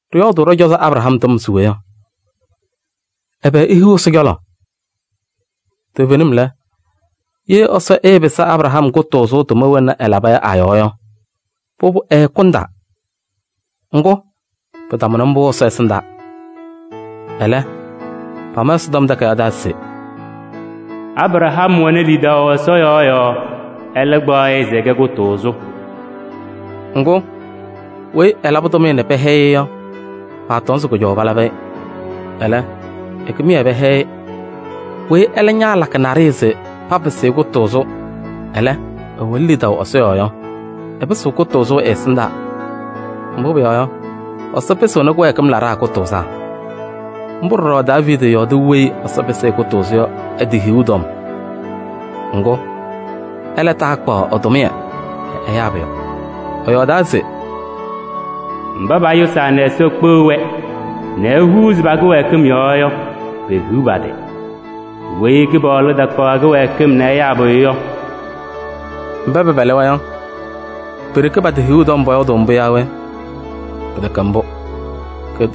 Ɖɩyɔɔdʋʋ ɖɔ-cɔzɔ Abraham tɔm se we yɔ? Ɛbɛ ehiɣ Ɛsɔ cɔlɔ? Toovenim lɛ, ye Ɛsɔ ɛɛpɩsɩ Abraham kʋtʋʋzʋ tʋma wena ɛlaba yɔ a-yɔɔ yɔ, pʋbʋ ɛɛkʋndaa. Ŋgʋ, pɩtamʋnɩ mbʋ Ɛsɔ ɛsɩndaa. Ɛlɛ pama Ɛsɔtɔm Takayaɣ taa se: “Abraham wɛnɩ lidaʋ Ɛsɔ yɔɔ yɔɔ, ɛlɛ kpaɣ-ɩ se ɛkɛ kʋtʋʋzʋ.” Ŋgʋ, weyi ɛlabɩ tʋmɩyɛ nɛ pɛhɛyɩ-ɩ yɔ, paatɔŋ se kʋjɔʋ palabɩ-ɩ. Ɛlɛ, ɛ-kɩmɩyɛ pɛhɛyɩ-ɩ. Weyi ɛlɛ ñaalakɩ naɖɩyɛ se papɩsɩ-ɩ kʋtʋʋzʋ, ɛlɛ, ɛwɛnɩ lidaʋ Ɛsɔ yɔɔ yɔ, ɛpɩsɩɣ kʋtʋʋzʋ ɛ-ɛsɩndaa. Mbʋ pʋyɔɔ yɔ, Ɛsɔ pɩsɩɣnɩ kɩwɛɛkɩm laɖaa kʋtʋʋzaa. Mbʋ ɖɔɖɔ Daaviidi yɔɔdɩ weyi Ɛsɔ pɩsɩ-ɩ kʋtʋʋzʋ yɔ ɛ-tɩ hiɣu tɔm. Ŋgʋ, ɛlɛ taakpaɣ ɛ-tʋmɩyɛ nɛ ɛyaa pʋyʋ. Ɛyɔɔdaa se: “Mba payʋsaa nɛ Ɛsɔ kpeɣ-wɛ nɛ ehuuzi pa-kɩwɛɛkɩm yɔɔ yɔ, pehiɣ pa-tɩ! Weyi Kɩpaɣlʋ takpaɣ ɛ-kɩwɛɛkɩm nɛ ɛyaa pʋyʋ yɔ, ehiɣ ɛ-tɩ!” Mba pɛpɛlɩ-wɛ yɔ, pe-ɖeke pa-tɩ hiɣu tɔm pɔyɔɔdʋʋ mbʋ yaa we? Pɩtɛkɛ mbʋ!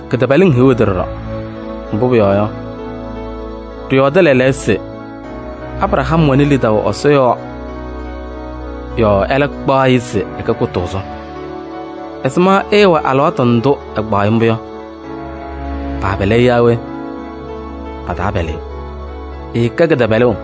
Kɩtɛpɛlɩŋ hiɣ ɩ-tɩ ɖɔɖɔ. Mbʋ pʋyɔɔ yɔ, ɖɩyɔɔdɩ lɛɛlɛɛyɔ se: “Abraham wɛnɩ lidaʋ Ɛsɔ yɔɔ yɔɔ ɛlɛ kpaɣ-ɩ se ɛkɛ kʋtʋʋzʋ.” Ɛzɩma ɛɛwɛ alɩwaatʋ ndʋ Ɛsɔ kpaɣ-ɩ mbʋ yɔ? Paapɛlɩ-ɩ yaa we? Pataapɛlɩ-ɩ. Ɛɛkɛ kɩtɛpɛlʋʋ.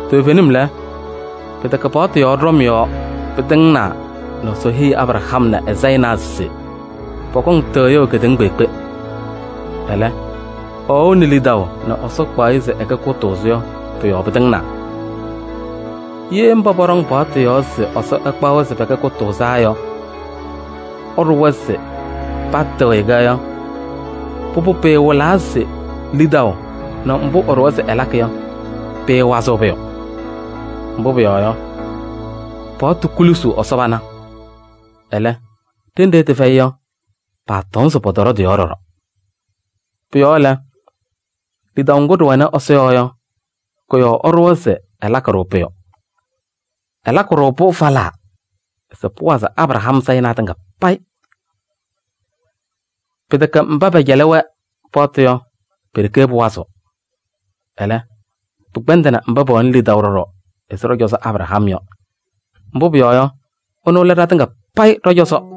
Toovenim lɛ, pɩtɛkɛ paɣtʋ yɔɔ ɖɔm yɔɔ pɩtɩŋnaa nɛ Ɛsɔ heyi Abraham nɛ ɛ-sayɩnaa se pɔkɔŋ tɩɣyʋʋ kedeŋa kpeekpe. Ɛlɛ, ɛwɛʋnɩ lidaʋ nɛ Ɛsɔ kpaɣ-ɩ se ɛkɛ kʋtʋʋzʋ yɔ, pʋ-yɔɔ pɩtɩŋnaa. Ye mba pɔɖɔŋ paɣtʋ yɔɔ se Ɛsɔ ɛkpaɣ-wɛ se pɛkɛ kʋtʋʋzaa yɔ ɛɖʋwa se patɩɣyɩ-kɛ yɔ, pʋbʋ pɩɩwɩlaa se lidaʋ nɛ mbʋ ɛɖʋwa se ɛlakɩ yɔ, pɩɩwazɩɣ pʋyʋ. Mbʋ pʋyɔɔ yɔ, paɣtʋ kulusuu Ɛsɔ pana. Ɛlɛ, ɖenɖe tɩfɛyɩ yɔ, paatɔŋ se pɔtɔɖɔ tɩ-yɔɔ ɖɔɖɔ. Pʋ-yɔɔ lɛ, lidaʋ ŋgʋ ɖɩwɛnɩ Ɛsɔ yɔɔ yɔ, kʋ-yɔɔ ɛɖʋwa se ɛlakɩ-ɖʋ pʋyʋ. Ɛlakɩ-ɖʋ-pʋ falaa se pʋwazɩ Abraham sayɩnaa tɩŋa payɩ. Pɩtɛkɛ mba pɛcɛlɩ-wɛ paɣtʋ yɔ, pe-ɖeke pʋwazɩɣ. Ɛlɛ, pɩkpɛndɩnɩ mba pɛwɛnɩ lidaʋ ɖɔɖɔ ɛzɩ ɖɔ-cɔzɔ Abraham yɔ, mbʋ pʋyɔɔ yɔ, ɛnʋ lɛ ɖatɩŋa payɩ ɖɔ-cɔzɔ.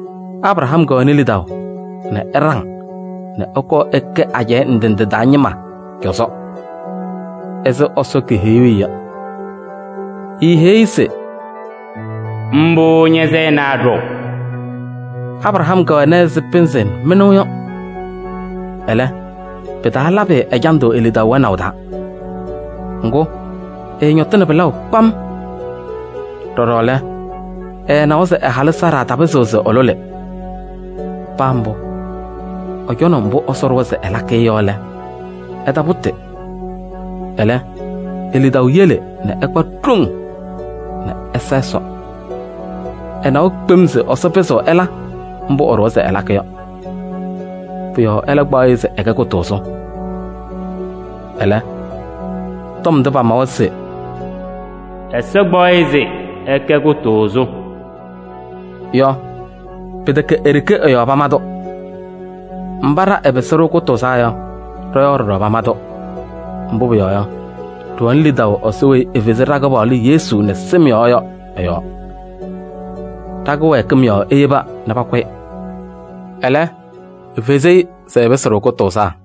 Abraham kɛwɛnɩ lidaʋ nɛ ɛɖaŋ nɛ ɛkɔɔ ɛkɛ ajɛɛ ndɩ ndɩ taa ñɩma cɔzɔ ɛzɩ Ɛsɔ keheyuu-i yɔ. Eeheyi-i se: “Mbʋ ña-sayɩnaa ɖɔʋ.” Abraham kɛwɛna ɛzɩ pɩnzɩ mɩnʋʋ yɔ. Ɛlɛ, pɩtaalabɩ-ɩ ɛjandʋ e-lidaʋ wɛnaʋ taa, ŋgʋ, ɛɛñɔtɩnɩ pɩlaʋ kpam. Ɖɔɖɔ lɛ, ɛɛnawa se ɛ-halʋ Saara tapɩzɩɣ se ɛlʋlɩ. Paa mbʋ, ɛcɔnɩ mbʋ Ɛsɔ ɖʋwa se ɛlakɩ-ɩ yɔ lɛ, ɛtapʋtɩ. Ɛlɛ, e-lidaʋ yele nɛ ɛkpa ɖoŋ nɛ ɛsa Ɛsɔ. Ɛnawa kpem se Ɛsɔ pɩzɩɣ ɛla mbʋ ɛɖʋwa se ɛlakɩ yɔ. Pʋ-yɔɔ ɛlɛ kpaɣ-ɩ se ɛkɛ kʋtʋʋzʋ. Ɛlɛ, tɔm ndʋ pamawa se: “Ɛsɔ kpaɣ-ɩ se ɛkɛ kʋtʋʋzʋ” yɔ, pɩtɛkɛ e-ɖeke ɛ-yɔɔ pama-tʋ. Mba ɖa ɛpɩsɩ-ɖʋ kʋtʋʋzaa yɔ, ɖɔ-yɔɔ ɖɔɖɔ pama-tʋ. Mbʋ pʋyɔɔ yɔ, ɖɩwɛnɩ lidaʋ Ɛsɔ weyi efezi ɖa-Kɩpaɣlʋ Yesu nɛ sɩm yɔɔ yɔ ɛ-yɔɔ. Ɖa-kɩwɛɛkɩm yɔɔ eyeba nɛ pakʋ-ɩ, ɛlɛ, efezi-i se ɛpɩsɩ-ɖʋ kʋtʋʋzaa.